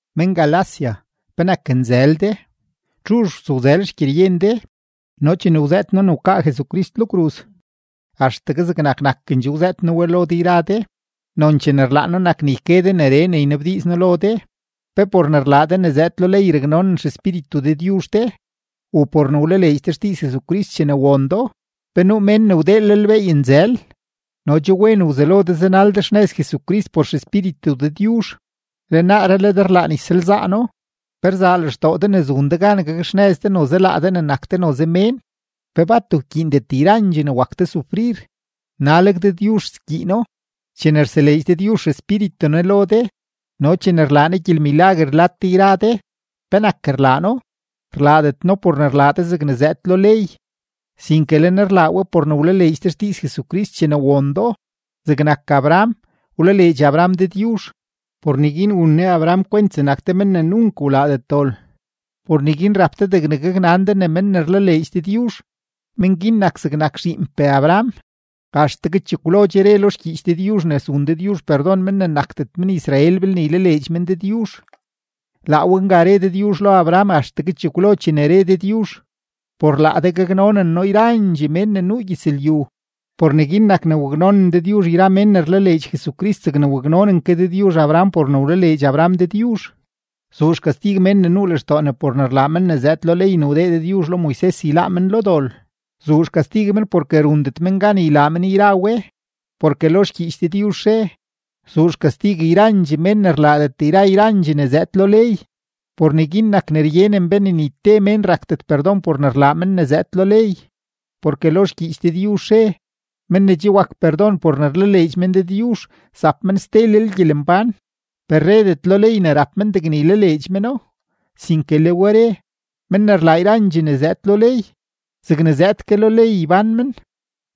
¡Men-Galacia, penak nzël de! ¿Txuzh wtsowzël xgyeryen de? No chene wzëët noo ne wkaa Jesucrist lo kruz, axtegue zegnak nakendxoo wzëët noo we lo de yra de. Nonchee ne rlaan noo nak ne yke de neree ne ynabdiiz noo lo de: ¿Pe por ne rlaa de ne zëëd lo ley raknonen XEspíritu Dëdyuzh de u por ne wlaleedx de xdiiz Jesucrist chene won do? ¡Pe nuu mén ne wdeelel beey nzël! No che wen wzelo de zanal de xnëz Jesucrist por XEspíritu Dëdyuzh, le naaree le de rlaan ysalzaano. ¿Pe rzaa lextoo de ne zun de gan gakxnëz de noze laa de ne nak de noze mén? ¿Pe bat wkyiindet yrandxee ne wak de sufrir? ¡Naleg Dëdyuzh skyiino! Chene rseleedx Dëdyuzh XEspíritu Ne lo de no chene rlaa Ne gyelmilaguer lad de yra de, ¿penak rlaa No? Rlaadet No por ne rlaa de zegne zëëd lo ley, sinke le Ne rlaa we por ne wlaleedx de xdiiz Jesucrist chene won do. Zegnak Abraham, wlaleedx Abraham Dëdyuzh; por neguin wun Ne Abraham kwent zegnak te men ne nunk wlaadet dol. Por neguin rap de degne gaknan de ne men ne rlaleedx Dëdyuzh, men guin nak zegnak zhiinpee Abraham. Axtegue chekwlo che re lo xgyiich Dëdyuzh ne zun Dëdyuzh perdon men ne nakdet men-Israel belne ylaleedx men Dëdyuzh. Laa we nga re Dëdyuzh lo Abraham axtegue chekwlo chene re Dëdyuzh: “Por laa de gaknonen noo yrandxee mén ne nuu gyëzlyu.” Por neguin nak ne raknonen Dëdyuzh yra mén ne rlaleedx Jesucrist zegne waknonen ke Dëdyuzh Abraham por ne wlaleedx Abraham Dëdyuzh. Zuu xkastig men ne nuu lextoo ne por ne rlaa men ne zëëd lo ley ne wdee Dëdyuzh lo Moises yláá men lo dol. Zuu xkastig men porke rundet men gan ylaa men yra we, porke lo xgyiich Dëdyuzh re: “Zuu xkastig yrandxee mén ne rlaadet yra yrandxee ne zëëd lo ley.” Por neguin nak ne ryenen be ne ni te mén rakdet perdon por ne rlaa men ne zëëd lo ley; porke lo xgyiich Dëdyuzh re: “Men ne che wak perdon por ne rlaleedx men Dëdyuzh zap men stelel gyelembán.” Per redet lo ley ne rap mén degne ylaleedx meno, sinke le we re: “Men ne rlaa yrandxee ne zëëd lo ley, zegne zëëd ke lo ley ybán men.”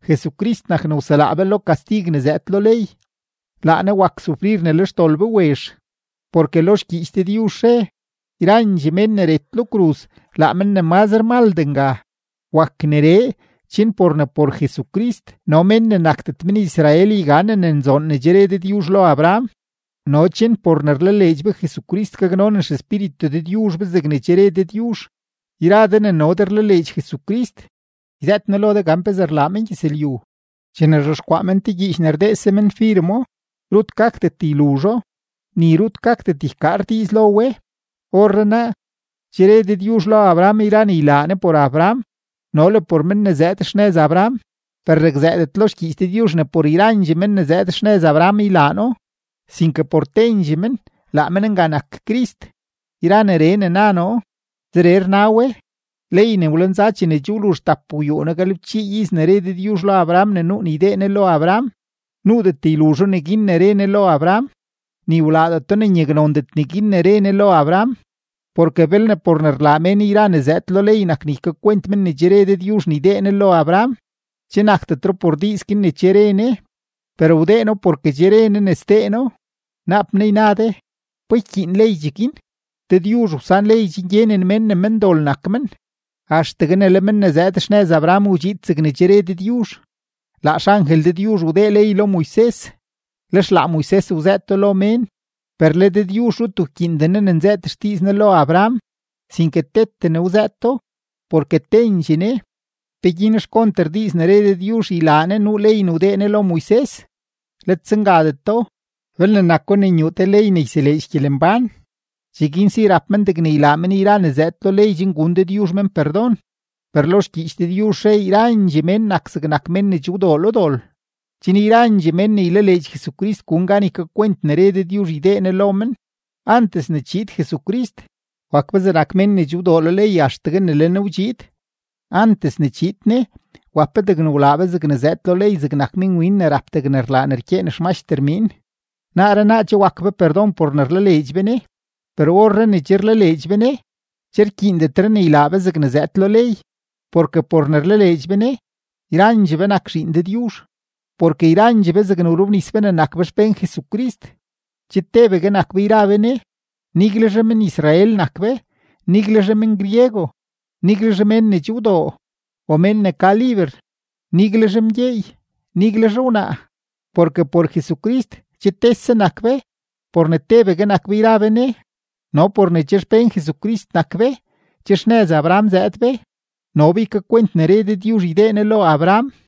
Jesucrist nak ne wselaa be lo kastig ne zëëd lo ley, laa Ne wak sufrir ne le xdol be wezh, porke lo xgyiich Dëdyuzh re: “Yrandxee mén ne ret lo kruz laa men ne mazre maldee nga.” Wak neree, chen por ne por Jesucrist no mén ne nakdet men-Israel yganen ne nzoon ne che re Dëdyuzh lo Abraham no chen por ne rlaleedx be Jesucrist gaknonen XEspíritu Dëdyuzh be zegne che re Dëdyuzh. Yra de ne no de rlaleedx Jesucrist, yzëët noo lo de gan pezee rlaa mengyëzlyu: Chene rzhexkwaa men te gyiich ne rdeese men firemo, rut gakdet yluzho, ni rut gakdet ykaar diiz lo we. Orrenaa, che re Dëdyuzh lo Abraham yra ne ylaa Ne por Abraham no le por men ne zëëd xnëz Abraham. Per rakzëëdet lo xgyiich Dëdyuzh ne por yrandxee men ne zëëd xnëz Abraham ylaa No, sinke por tendxee men, laa men nga nak Crist. Yra neree ne na noo, zeree rna we: Ley ne wlenza chene che wluzh tapgwyuuno-galebchii iz ne re Dëdyuzh lo Abraham ne nuu ne ydee Ne lo Abraham, nuudet yluzho neguin ne re Ne lo Abraham, ni wlaadeto ne nyaknondet neguin ne re Ne lo Abraham. Porke belne por ne rlaa mén yra ne zëëd lo ley nak ne ykakwent men ne che re Dëdyuzh ne ydee Ne lo Abraham, che nakdetro por diiz guin ne che re Ne, per wdee No porke che re Ne ne sdee No. Naap naa yna de: “¿Pa ykyiin ley cheguin?” Dëdyuzh wsan ley chen gyenen mén ne mendol nak mén axtegue ne le “men ne zëëd xnëz Abraham” wdxiid zegne che re Dëdyuzh. Laa xangel Dëdyuzh wdee ley lo Moises, lex laa Moises wzëëto lo mén. Per le Dëdyuzh rut wkyiinden Ne ne nzëët xdiiz Ne lo Abraham, sinke tete Ne wzëëto, porke tendxee Ne. ¿Peguin xkonter diiz ne re Dëdyuzh ylaa Ne nuu ley ne wdee Ne lo Moises? Let zengadeto. Belne nako ne nyuu te ley ne yseleedx gyelembán, cheguin si rap men degne ylaa men yra ne zëëd lo ley chen gun Dëdyuzh men perdon. Per lo xgyiich Dëdyuzh re yrandxee mén nak zegnak mén ne che wdoo lo dol, chen yrandxee mén ne ylaleedx Jesucrist gun gan ykakwent ne re Dëdyuzh ydee Ne lo men. Antes ne chiid Jesucrist, wak be zegnak mén ne che wdoo lo ley axtegue ne le Ne wdxiid. Antes ne chiid Ne, wap be degne wlaa be zegne zëëd lo ley zegnak minwin ne rap degne rlaa ne rkyeen xmaxter miin. Naaree naa che wak be perdon por ne rlaleedx be Ne. Per orree ne che rlaleedx be Ne, che rkyiindetre ne ylaa be zegne zëëd lo ley. Porke por ne rlaleedx be Ne, yrandxee be nak zhiin Dëdyuzh. Porke yrandxee be zegne wrobnis be ne nak be xpén Jesucrist, che tebegue nak be yra be Ne, niguelzhe men-Israel nak be, niguelzhe men-griego, niguelzhe mén ne che wdoo o mén ne ka liber, niguelzhe mgyeey, niguelzhe wnaa, porke por Jesucrist che tese nak be por ne tebegue nak be yra be Ne. No por ne che xpén Jesucrist nak be, che xnëz Abraham zëëd be, no be ykakwent ne re Dëdyuzh ydee Ne lo Abraham.